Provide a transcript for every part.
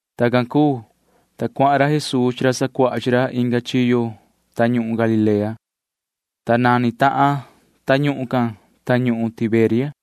Tacan cuu, ta cuahan ra Jesuu chi ra sacuaha chi ra inga chiyo tañuhun Galilea, ta nani tahan tañuhun can tañuhun Tiberia.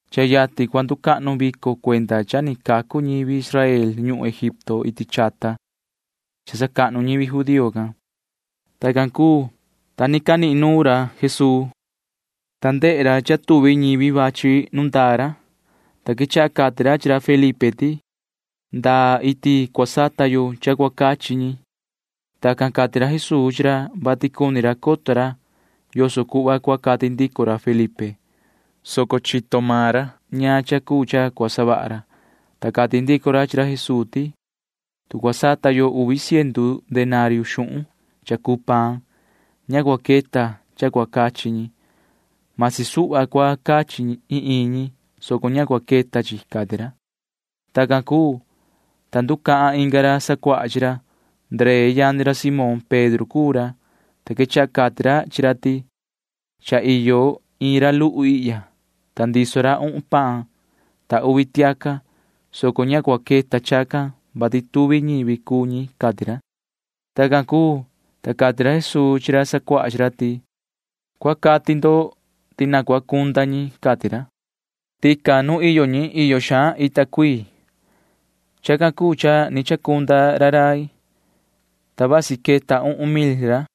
Cha yatin cua nducahnu vico cuenda cha ni cacu ñivi Israel ñuhun Egipto iti chata cha sacahnu ñivi judío can. Tacan cuu, ta ni canihin nuun ra Jesuu, ta ndehe ra cha tuvi ñivi vachi nu ndaa ra, ta quechaha cati ra chi ra Felipe ti: ―¿Ndaa iti cua sata yo cha cua cachi ñi? Tacan cati ra Jesuu chi ra, vati cuni ra coto ra yoso cuhva cua cati ndico ra Felipe, soco chito maan ra ñaan cha cuu cha cua savaha ra, ta cati ndico ra chi ra Jesuu ti: ―Tu cua sata yo uvi ciendu denario xuhun cha cuu paan, ña cua queta cha cua cachi ñi. Masi suhva cua cachi iin iin ñi, soco ña cua queta chi ―cati ra. Tacan cuu, ta nducahan inga ra sacuaha chi ra. Ndree yani ra Simón Pedro cuu ra, ta quechaha cati ra chi ra ti: ―Cha iyo iin ra luhu ihya, ta ndiso ra uhun paan ta uvi tiaca, soco ña cua queta chacan, vati tuvi ñivi cuu ñi ―cati ra. Tacan cuu, ta cati ra Jesuu chi ra sacuaha chi ra ti: ―Cua cati ndo ti na cua cunda ñi ―cati ra. Tican nu iyo ñi iyo xaan ita cuii. Chacan cuu cha ni chacunda ra rai, ta vasi queta uhun mil ra.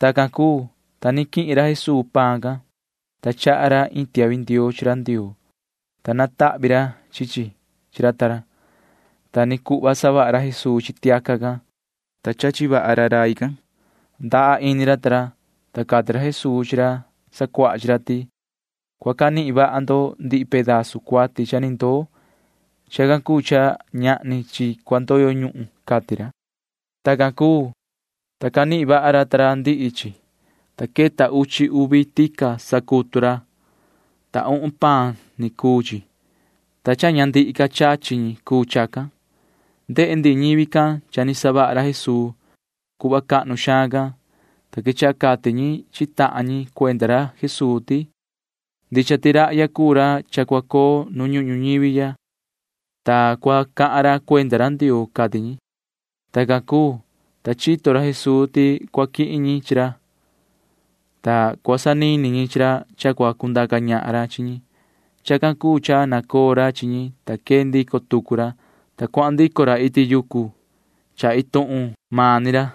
Tacan cuu, ta ni quihin ra Jesuu paan can, ta chaha ra iin tiahvi ndioo chi ra Ndioo, ta natahvi ra chi chi chi ra ta ra. Ta ni cuhva savaha ra Jesuu chi tiaca can, ta chachi vaha ra rai can. Ndaha ini ra ta ra, ta cati ra Jesuu chi ra sacuaha chi ra ti: ―Cua canihin vaha ndo ndihi pedazu cuati cha ni ndoo. Chacan cuu cha ñahni chi cua ndoyo ñuhun ―cati ra. Tacan cuu, ta canihin vaha ra ta ra ndihi chi, ta queta uchi uvi tica sacutu ra, ta uhun paan ni cuu chi, ta cha ña ni ndihi ca chachi ñi cuu chacan. Ndehe ndihi ñivi can cha ni savaha ra Jesuu cuhva cahnu xaan can, ta quechaha cati ñi chi tahan ñi cuenda ra Jesuu ti: ―Ndicha ti rahya cuu ra cha cua coo nu ñuhun ñuñivi ya, ta cua cahan ra cuenda ra Ndioo ―cati ñi. Tacan cuu, ta chito ra Jesuu ti cua quihin ñi chi ra, ta cua sanini ñi chi ra cha cua cundaca ñahan ra chi ñi. Chacan cuu cha nacoo ra chi ñi, ta quee ndico tucu ra, ta cuahan ndico ra iti yucu cha maan iin tuhun ni ra.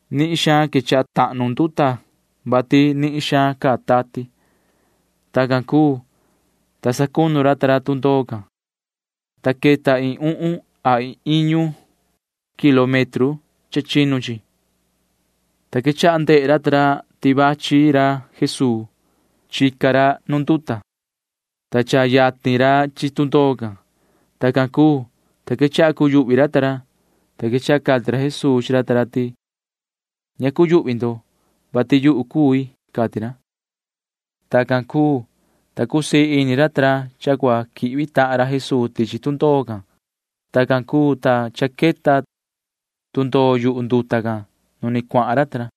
Nihin suhva quechaha tahnu nduta, vati nihin xaan caa tati. Tacan cuu, ta sacunu ra ta ra tundoo can, ta queta iin uhun a iin iñu kilómetro cha chinu chi, ta quechaha ndehe ra ta ra ti cha vachi ra Jesuu. Chica ra nu nduta, ta cha cuyatin ra chi tundoo can. Tacan cuu, ta quechaha cuyuhvi ra ta ra, ta quechaha cati ra Jesuu chi ra ta ra ti: ―Ña cuyuhvi ndo, vati yuhu cui ―cati ra. Tacan cuu, ta cusii ini ra ta ra cha cua quihvi tahan ra Jesuu tichi tundoo can. Tacan cuu, ta cha queta tundoo yuhu nduta can nu ni cuahan ra ta ra.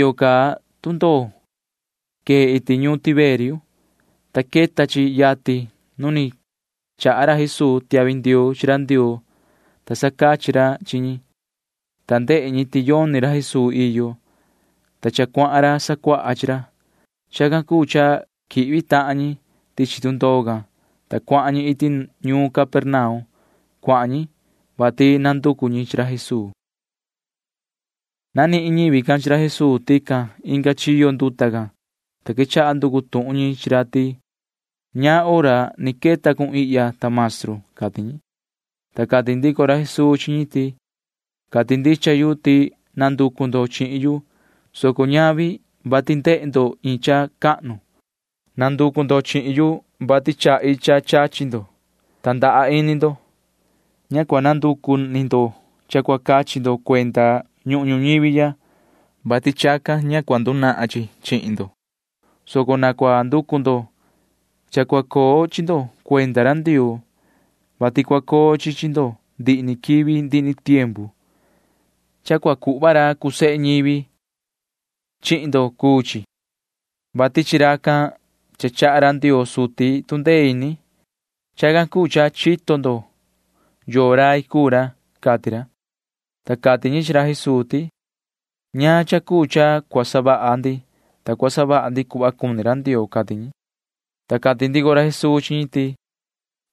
Iyo ca tundoo quee iti ñuun Tiberia, ta queta chi yatin nu ni chaha ra Jesuu tiahvi ndioo chi ra Ndioo, ta sacachi ra chi ñi, ta ndehe ñi ti yoni ra Jesuu iyo, ta cha cuahan ra sacuaha chi ra. Chacan cuu cha quihvi tahan ñi tichi tundoo can, ta cuahan ñi iti ñuun Capernaum. Cuahan ñi, vati nanducu ñi chi ra Jesuu. Nanihin ñivi can chi ra Jesuu tican inga chiyo nduta can, ta quechaha nducu tuhun ñi chi ra ti: ―¿Ñaan hora ni queta cun ihya, ta Maestru? ―cati ñi. Ta cati ndico ra Jesuu chi ñi ti: ―Cati ndicha yu ti nanducu ndo chihin yu, soco ñavi vati ndehe ndo iin cha cahnu. Nanducu ndo chihin yu, vati chahi cha chachi ndo, ta ndaha ini ndo. Ña cua nanducu ni ndo cha cua cachi ndo cuenda ñuhun ñuñivi ya, vati chacan ña cua ndunahan chi chi ndo, soco na cua nducu ndo cha cua coo chi ndo cuenda ra Ndioo, vati cua coo chi chi ndo ndihi ni quivi ndihi ni tiempu. Cha cua cuhva ra cuu sehe ñivi chihin ndo cuu chi, vati chi racan cha chaha ra Ndioo suti tu ndee ini. [Chacan cuu cha chito ndo yoo rai cuu ra] ―cati ra. Ta cati ñi chi ra Jesuu ti: ―¿Ñaan cha cuu cha cua savaha ndi, ta cua savaha ndi cuhva cuni ra Ndioo? ―cati ñi. Ta cati ndico ra Jesuu chi ñi ti: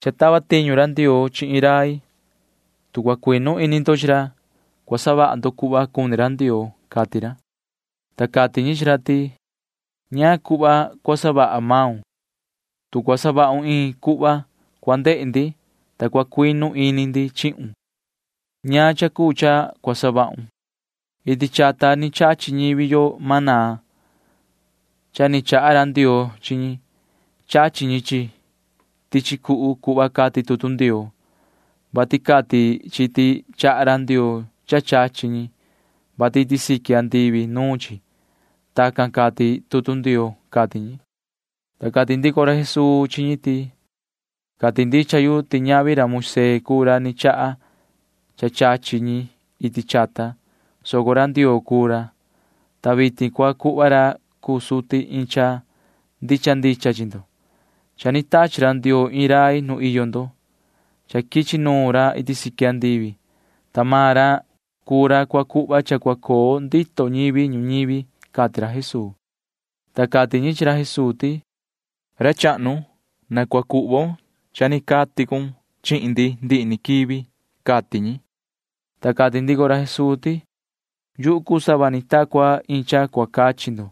―Cha tava tiñu ra Ndioo chi iin rai. Tu cua cuinu ini ndo chi ra, cua savaha ndo cuhva cuni ra Ndioo ―cati ra. Ta cati ñi chi ra ti: ―¿Ñaan cuhva cua savaha maun? Tu cua savahun iin cuhva, cua ndehe ndi, ta cua cuinu ini ndi chihun. ¿Ñaan cha cuu cha cua savahun? Iti chata ni chachi ñivi yo maná cha ni chaha ra Ndioo chi ñi. Chachi ñi chi chi tichi cuhu cuhva cati tutu Ndioo, vati cati chi ti chaha ra Ndioo cha chachi ñi, vati iti siqui andivi nuun chi. Tacan cati tutu Ndioo ―cati ñi. Ta cati ndico ra Jesuu chi ñi ti: ―Cati ndicha yu ti ñavi ra Moisee cuu ra ni chaha cha chachi ñi iti chata, soco ra Ndioo cuu ra, ta vitin cua cuhva ra cuu suti iin cha ndicha ndicha chi ndo. Cha ni tachi ra Ndioo iin rai nu iyo ndo. Cha quichi nuun ra iti siqui andivi, ta maan ra cuu ra cua cuhva cha cua coo ndito ñivi ñuñivi ―cati ra Jesuu. Ta cati ñi chi ra Jesuu ti: ―Ra chahnu, na cua cuhvon cha ni cati cun chihin ndi ndihi ni quivi ―cati ñi. Ta cati ndico ra Jesuu ti: ―Yuhu cuu sava ta cua iin cha cua cachi ndo,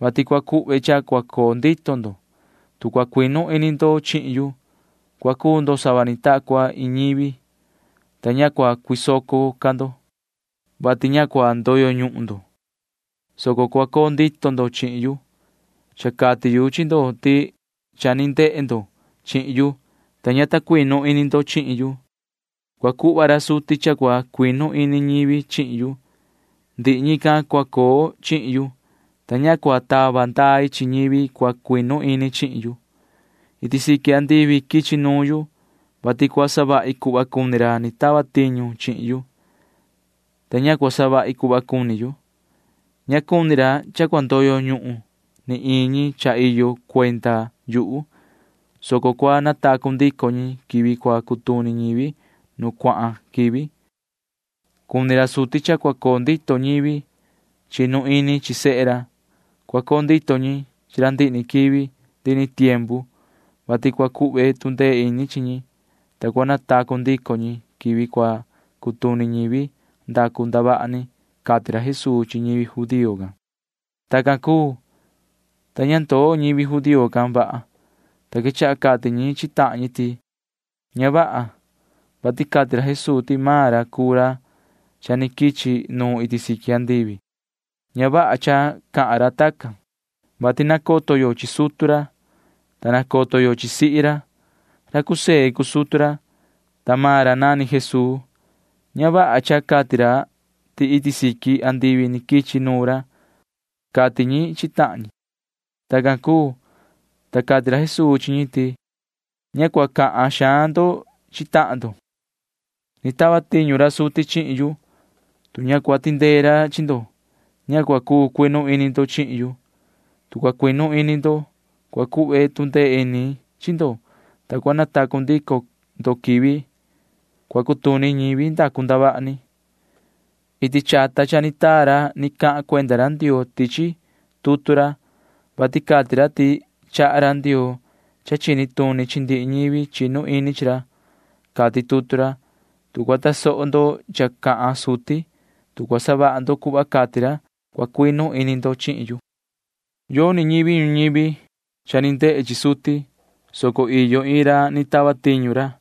vati cua cuhve cha cua coo ndito ndo. Tu cua cuinu ini ndo chihin yu, cua cuu ndo sava ni ta cua iin ñivi, ta ña cua cuisoco ca ndo, [vati ña cua ndoyo ñuhun ndo, soco cua coo ndito ndo chihin yu]. Cha cati yu chi ndo ti cha ni ndehe ndo chihin yu, ta ña ta cuinu ini ndo chihin yu. Cua cuhva ra suti cha cua cuinu ini ñivi chihin yu. Ndihi ñican cua coo chihin yu, ta ña cua tava ndai chi ñivi cua cuinu ini chihin yu. Iti siqui andivi quichi nuun yu, vati cua savahi cuhva cuni ra ni tava tiñu chihin yu, ta ña cua savahi cuhva cuni yu. Ña cuni ra cha cua ndoyo ñuhun ni iin ñi cha iyo cuenda yuhu, soco cua natacu ndico ñi quivi cua cutuni ñivi nu cuahan quivi. Cuni ra suti cha cua coo ndito ñivi chinu ini chi sehe ra. Cua coo ndito ñi chi ra ndihi ni quivi ndihi ni tiempu, vati cua cuhve tu ndee ini chi ñi, ta cua natacu ndico ñi quivi cua cutuni ñivi ndacu ndavaha ni ―cati ra Jesuu chi ñivi judío can. Tacan cuu, ta ña ndoo ñivi judío can vaha, ta quechaha cati ñi chi tahan ñi ti: ―Ña vaha, vati cati ra Jesuu ti maan ra cuu ra cha ni quichi nuun iti siqui andivi. Ña vaha cha cahan ra tacan, vati nacoto yo chi sutu ra, ta nacoto yo chi sihi ra. Ra José cuu sutu ra, ta maan ra nani Jesuu. Ña vaha cha cati ra ti iti siqui andivi ni quichi nuun ra ―cati ñi chi tahan ñi. Tacan cuu, ta cati ra Jesuu chi ñi ti: ―Ña cua cahan xaan ndo chi tahan ndo. Ni tava tiñu ra suti chihin yu. Tu ña cua tindee ra chi ndo, ña cua cuu cuinu ini ndo chihin yu. Tu cua cuinu ini ndo, cua cuhve tu ndee ini chi ndo, ta cua natacu ndico ndo quivi cua cutuni ñivi ndacu ndavaha ni. Iti chata cha ni taa ra ni cahan cuenda ra Ndioo tichi tutu ra, vati cati ra ti chaha ra Ndioo cha chini tuni chi ndihi ñivi chinu ini chi ra, cati tutu ra. Tu cua tasoho ndo cha cahan suti, tu cua savaha ndo cuhva cati ra, cua cuinu ini ndo chihin yu. ’Yoni ñivi ñuñivi cha ni ndehe chi suti, soco iyo iin ra ni tava tiñu ra,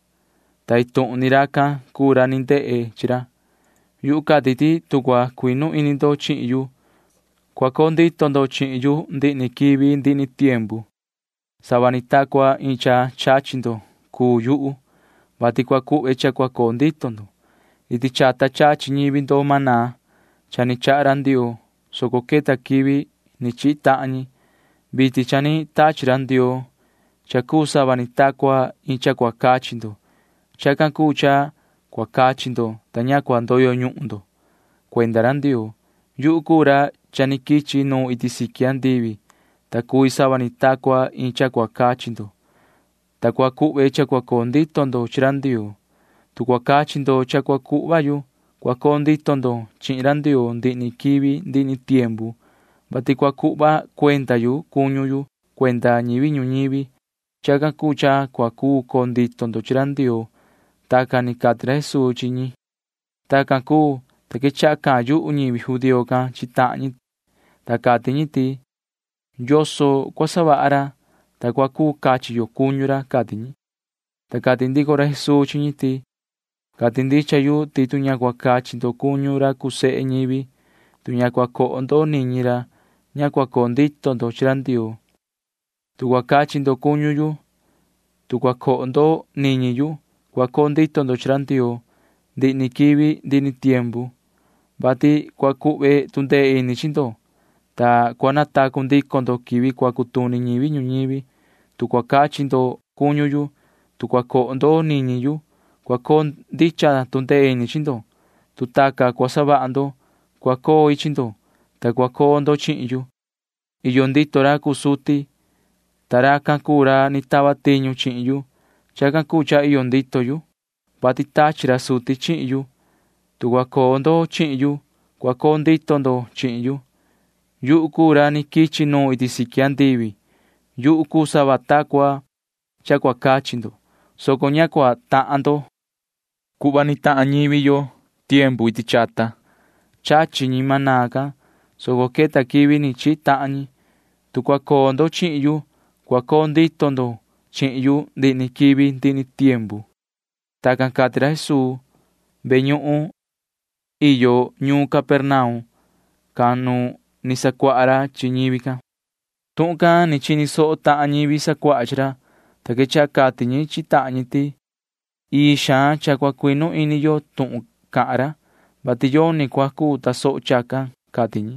ta iin tuhun ni racan cuu ra ni ndehe chi ra. Yuhu cati ti tu cua cuinu ini ndo chihin yu, cua coo ndito ndo chihin yu ndihi ni quivi ndihi ni tiempu. Sava ni ta cua iin cha chachi ndo cuu yuhu, vati cua cuhve cha cua coo ndito ndo. Iti chata chachi ñivi ndo maná cha ni chaha ra Ndioo, soco queta quivi ni chihi tahan ñi. Vitin cha ni tachi ra Ndioo cha cuu sava ni ta cua iin cha cua cachi ndo. Chacan cuu cha cua cachi ndo, ta ña cua ndoyo ñuhun ndo cuenda ra Ndioo. Yuhu cuu ra cha ni quichi nuun iti siqui andivi, ta cui sava ni ta cua iin cha cua cachi ndo, ta cua cuhve cha cua coo ndito ndo chi ra Ndioo. Tu cua cachi ndo cha cua cuhva yu, cua coo ndito ndo chihin ra Ndioo ndihi ni quivi ndihi ni tiempu, vati cua cuhva cuenda yu cuñu yu cuenda ñivi ñuñivi. Chacan cuu cha cua cuu coo ndito ñi chi ra Ndioo. Tacan ni cati ra Jesuu chi ñi. Tacan cuu, ta quechaha cahan yuhu ñivi judío can chi tahan ñi, ta cati ñi ti: ―¿Yoso cua savaha ra, ta cua cuu cachi yo cuñu ra? ―cati ñi. Ta cati ra Jesuu chi ñi ti: ―Cati ndicha yu ti tu ña cua cachi ndo cuñu ra cuu sehe ñivi, tu ña cua coho ndo niñi ra, ña cua coo ndito ndo chi ra Ndioo. Tu cua cachi ndo cuñu yu, tu cua coho ndo niñi yu, cua coo ndito ndo chi ra Ndioo ndihi ni quivi ndihi ni tiempu, vati cua cuhve tu ndee ini chi ndo, ta cua natacu ndico ndo quivi cua cutuni ñivi ñuñivi. Tu cua cachi ndo cuñu yu, tu cua coho ndo niñi yu, cua coo ndicha tu ndee ini chi ndo. Tu tacan cua savaha ndo, cua coi chi ndo, ta cua coo ndo chihin yu. Iyo ndito ra cuu suti, ta racan cuu ra ni tava tiñu chihin yu. Chacan cuu cha iyo ndito yu, vati tachi ra suti chihin yu. Tu cua coo ndo chihin yu, cua coo ndito ndo chihin yu. Yuhu cuu ra ni quichi nuun iti siqui andivi. Yuhu cuu sava ta cua cha cua cachi ndo, soco ña cua tahan ndo cuhva ni tahan ñivi yo iti chata. Chachi ñi maná can, soco queta quivi ni chihi tahan ñi. Tu cua coo ndo chihin yu, cua coo ndito ndo chihin yu ndihi ni quivi ndihi ni tiempu. Tacan cati ra Jesuu ve ñuhun iyo ñuun Capernaum can nu ni sacuaha ra chi ñivi can. Tuhun can ni chini soho tahan ñivi sacuaha chi ra, ta quechaha cati ñi chi tahan ñi ti: ―Ii xaan cha cua cuinu ini yo tuhun cahan ra, vati yoni cua cuu tasoho chacan ―cati ñi.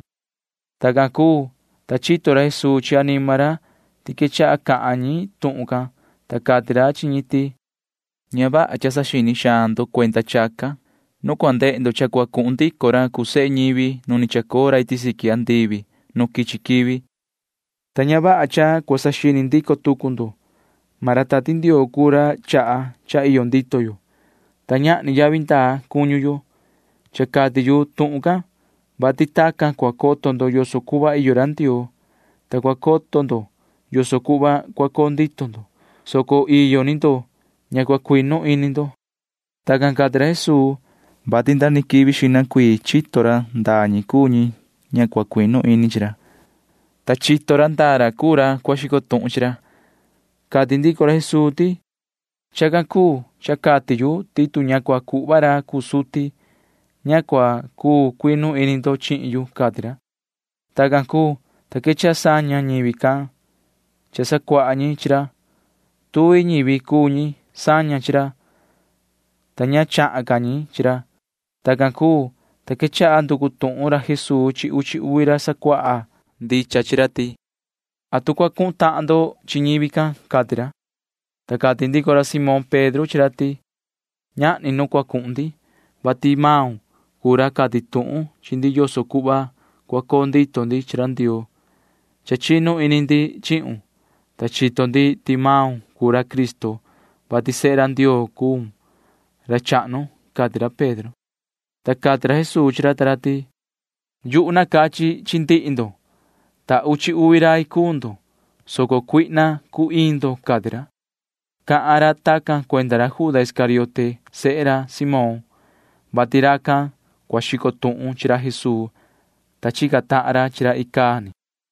Tacan cuu, ta chito ra Jesuu chi anima ra ti quechaha cahan ñi tuhun can, ta cati ra chi ñi ti: ―Ña vaha cha saxini xaan ndo cuenda chacan. Nu cua ndehe ndo cha cua cuhun ndico ra cuu sehe ñivi nu ni chacoo ra iti siqui andivi nu quichi quivi, ta ña vaha cha cua saxini ndico tucu ndo. Maan ra Tati Ndioo cuu ra chaha cha iyo ndito yo, ta ñahni yavi ndaa cuñu yo. Cha cati yu tuhun can, vati tacan cua coto ndo yoso cuhva iyo ra Ndioo, ta cua coto ndo yoso cuhva cua coo ndito ndo, soco iyo ni ndo ña cua cuinu ini ndo. Tacan cati ra Jesuu, vati nda ni quivi xihna cuii chito ra ndaa ñi cuu ñi ña cua cuinu ini chi ra, ta chito ra ndaa ra cuu ra cua xico tuhun chi ra. Cati ndico ra Jesuu ti: ―Chacan cuu cha cati yu ti tu ña cua cuhva ra cuu suti, ña cua cuu cuinu ini ndo chihin yu ―cati ra. Tacan cuu, ta quechaha saña ñivi sacuaha chi ra. Tuvi ñivi cuu ñi saña chi ra, ta ña chahan ca ñi chi ra. Tacan cuu, ta quechaha nducu tuhun ra Jesuu chi uchi uvi ra sacuaha ndicha chi ra ti: ―¿Atu cua cuhun tahan ndo chi ñivi can? ―cati ra. Ta cati ndico ra Simón Pedro chi ra ti: ―Ñahni nu cua cuhun ndi, vati maun cuu ra cati tuhun chi ndi yoso cuhva cua coo ndito ndi chi ra Ndioo. Cha chinu ini ndi chihun, ta cha chito ndi ti maun cuu ra Cristo, vati sehe ra Ndioo cuun, ra chahnu ―cati ra Pedro. Ta cati ra Jesuu chi ra ta ra ti: ―Yuhu nacachi chi ndihi ndo, ta uchi uvi rai cuu ndo, soco cuihna cuu iin ndo ―cati ra. Cahan ra tacan cuenda ra Juda Iscariote sehe ra Simón, vati racan cua xico tuhun chi ra Jesuu, ta chica tahan ra chi ra icaa ni.